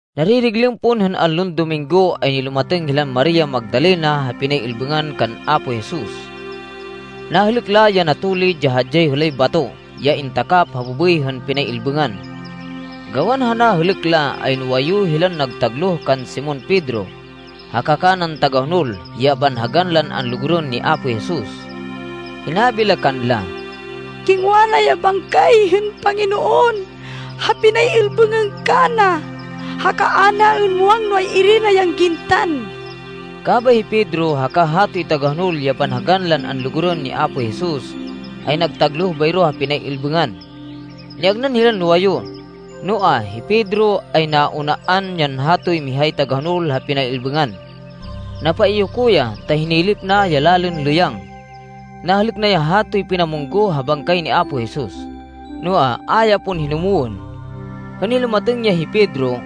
Naririglêm pon hên allon Dominggo, ay nilumatêng hilan Maria Magdalena ha pinay-ilbêngan kan Apo Jesus. Nahêlêk la ya natulid ya hadyay hêlay bato, ya intakap ha bêbêy hên pinay-ilbêngan. Gawan ha nahêlêk la, ay nuwayu hilan nagtagloh kan Simon Pedro, haka kanan tagahonol, ya banhagan lan anlugurên ni Apo Jesus. Hinabi la kanla, “Kingwa la ya bangkay hên Panginoon ha pinay-ilbêngan kana. Haka a naên muwang no ay-iri la yan gintan.” Kabay hi Pedro, haka hatoy tagahonol ya banhagan lan anlugurên ni Apo Jesus, ay nagtagloh bayro ha pinay-ilbêngan. Niagnan hilan nuwayu, noa, hi Pedro ay naunaan yan hatoy mihay tagahonol ha pinay-ilbêngan. Napaiyoko ya, ta hinilip na ya lalên lêyang. Nahêlêk na ya hatoy pinamunggoh ha bangkay ni Apo Jesus, noa, a ya pon hinumwên. Hên nilumatêng ya hi Pedro,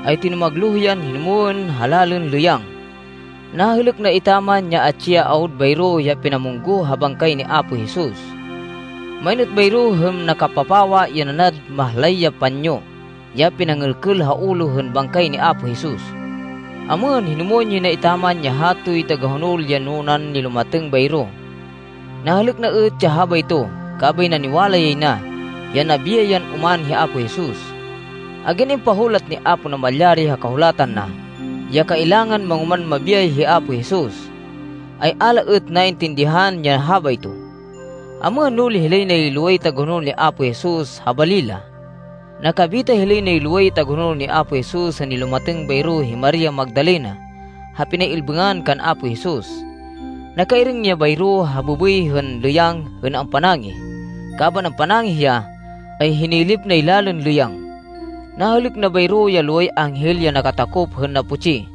ay tinumagloh yan hinumwên ha lalên lêyang. Nahêlêk na etaman, ya atsi ya awud bayro ya pinamunggoh ha bangkay ni Apo Jesus. Main êt bayro, hên nakapapawa, ya nanad mahlay ya panyo, ya pinangêlkêl ha ulo hên bangkay ni Apo Jesus. Amêhên, hinumwên yay na etaman ya hatoy tagahonol ya nunan nilumatêng bayro. Nahêlêk na êt ya habayto, kabay naniwala yay na, ya nabiyay yan oman hi Apo Jesus. Agyan impahulat ni Apo Namalyari ha Kahulatan na, ya kailangan mangoman mabiyay hi Apo Jesus, ay a la êt naintindihan ya habayto. Amêhên, nuli hilay nay loway tagahonol ni Apo Jesus ha bali la. Nakabita hilay nay loway tagahonol ni Apo Jesus hên nilumatêng bayro hi Maria Magdalena ha pinay-ilbêngan kan Apo Jesus. Nakairêng ya bayro ha bêbêy hên lêyang hên ampanangih. Kaban ampanangih ya, ay hinilip nay lalên lêyang. Nahêlêk na bayro ya loway anghel ya nakatakop hên naputsi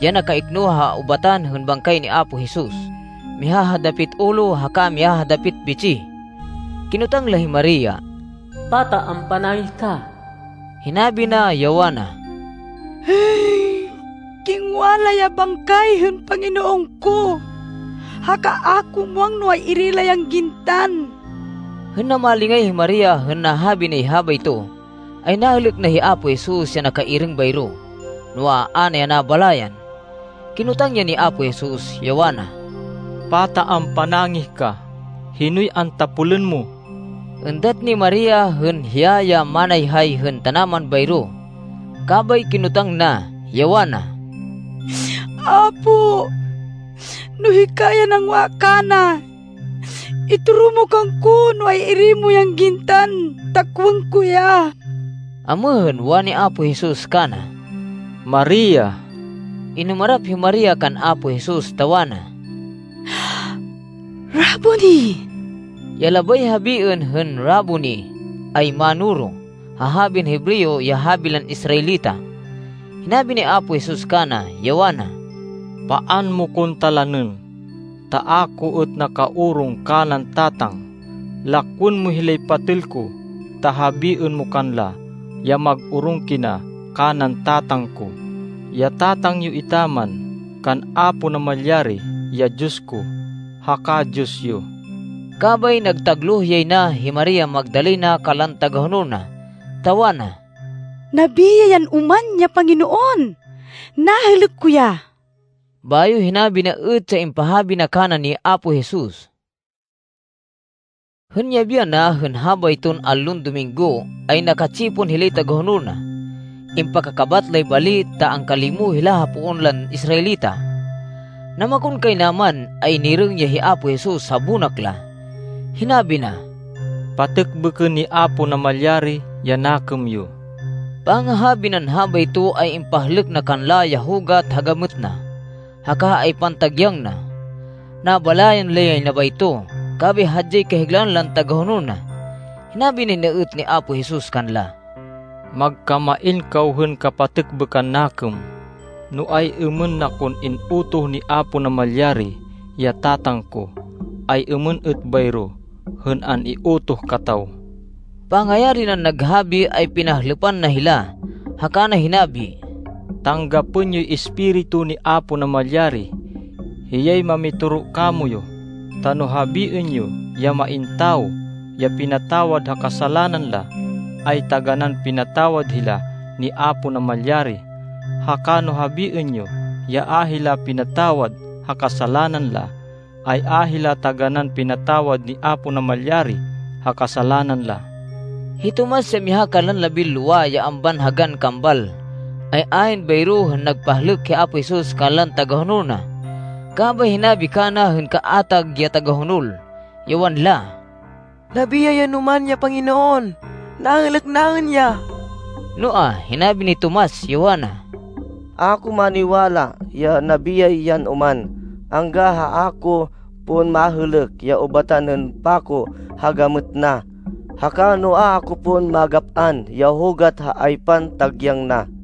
ya nakaikno ha ubatan hên bangkay ni Apo Jesus, miha ha dapit ulo haka miha ha dapit bitsih. Kinotang la hi Maria, “Pata ampanangih ka?” Hinabi na, ya wana, “Kingwa la ya bangkay hên Panginoon ko, haka a ko muwang no ay-iri la yan gintan.” Hên namalingay hi Maria hên nahabi nay habayto, ay nahêlêk na hi Apo Jesus ya nakairêng bayro, noa, a na ya nabalayan. Kinotang ya ni Apo Jesus, ya wana, “Pata ampanangih ka? Hinoy antapolên mo?” Êndat ni Maria hên hiya ya manayhay hên tanaman bayro. Kabay kinotang na, ya wana, “Apo, no hika ya nangwa kana, itoro mo kangko no ay-iri mo yan gintan ta kowên ko ya.” Amêhên, wani Apo Jesus kana, “Maria.” Inumarap hi Maria kan Apo Jesus, ta wana, “Raboni.” (Ya labay habiên hên “Raboni” ay “Mánoro” ha habin Hebreo ya habi lan Israelita.) Hinabi ni Apo Jesus kana, ya wana, “Paan mo kon talanên ta a ko êt nakaorong kanan Tatang. Lakwên mo hilay patêl ko ta habiên mo kanla ya mag-orong kina kanan Tatang ko, ya Tatang yo etaman, kan Apo Namalyari, ya Diyos ko haka Diyos yo.” Kabay nagtagloh yay na hi Maria Magdalena kanlan tagahonol na, ta wana, “Nabiyay yan oman ya Panginoon! Nahêlêk ko ya!” Bayo hinabi na êt ya impahabi na kana ni Apo Jesus. Hên yabi yana hên habayton allon Dominggo, ay naka-tsipon hilay tagahonol na. Impakakabat lay bali ta angkalimo hila ha poon lan Israelita. Namakonkaynaman ay nirêng ya hi Apo Jesus ha bonak la. Hinabi na, “Patêkbêkên ni Apo Namalyari ya nakêm yo.” Pangahabi nan habayto, ay impahlêk na kanla ya hugat ha gamêt na, haka ha aypan tagyang na. Nabalayan la yay na bayto, kabay hadyay kahiglaan lan tagahonol na. Hinabi nay na êt ni Apo Jesus kanla, “Magkamain kaw hên kapatêkbêkan nakêm. No ay-êmên na kon in-utoh ni Apo Namalyari, ya Tatang ko, ay êmên êt bayro hên an-iutoh kataw.” Pangayari nan naghabi ay pinahlêpan na hila haka na hinabi, “Tanggapên yoy Espiritu ni Apo Namalyari. Hiyay mamitoro kamoyu, ta no habiên yo ya main tawo ya pinatawad ha kasalanan la, ay taganán pinatawad hila ni Apo Namalyari. Haka no habiên yo ya a hila pinatawad ha kasalanan la, ay a hila taganán pinatawad ni Apo Namalyari ha kasalanan la.” Hi Tomas, ya miha kanlan labinlowa, ya ambanhagan Kambal, ay ayn bayro hên nagpahlêk hi Apo Jesus kanlan tagahonol na. Kabay hinabi kana hên kaatag ya tagahonol, ya wanla, “Nabiyay yan oman ya Panginoon. Nahêlêk naên ya.” Noa, hinabi ni Tomas, ya wana, “A ko maniwala ya nabiyay yan oman, angga ha a ko pon mahêlêk ya ubatan hên pako ha gamêt na, haka no a ko pon magap-an ya hugat ha aypan tagyang na.”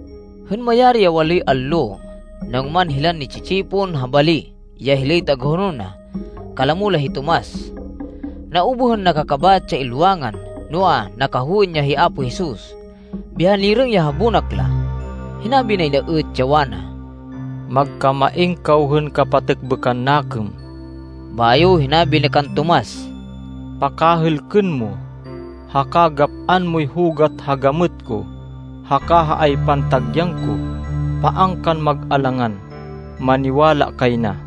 Hên mayari ya waloy allo, nangoman hilan ni-tsi-tsipon ha bali, ya hilay tagahonol na. Kalamo la hi Tomas. Naubuh hên nakakabat ya ilwangan, noa, nakahowên ya hi Apo Jesus, biha nirêng ya ha bonak la. Hinabi nay na êt, ya wana, “Magkamain kaw hên kapatêkbêkan nakêm.” Bayo hinabi na kan Tomas, “Pakahêlkên mo, haka gap-an moy hugat ha gamêt ko haka ha aypan tagyang ko. Paan kan mag-alangan. Maniwala kay na.”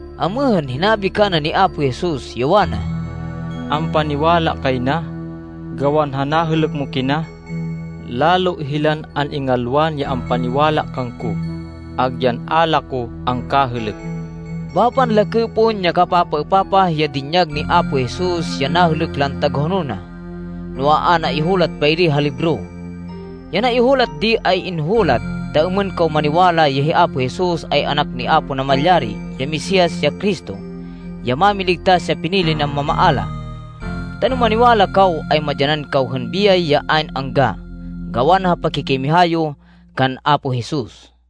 Amêhên, hinabi kana ni Apo Jesus, ya wana, “Ampaniwala kay na, gawan ha nahêlêk mo kina? Lalo hilan an-ingalwan ya ampaniwala kangko, agyan a la ko angkahêlêk.” Bapan lakê pon ya kapapaêpapah ya dinyag ni Apo Jesus ya nahêlêk lan tagahonol na. Noa, a naihulat bayri ha libro. Ya naihulat di ay inhulat, ta êmên kaw maniwala ya hi Apo Jesus ay Anak ni Apo Namalyari, ya Mesias, ya Cristo, ya Mámiligtas ya pinili nan mamaala. Ta no maniwala kaw, ay madyanan kaw hên biyay ya ayn angga, gawan ha pakikimiha yo kan Apo Jesus.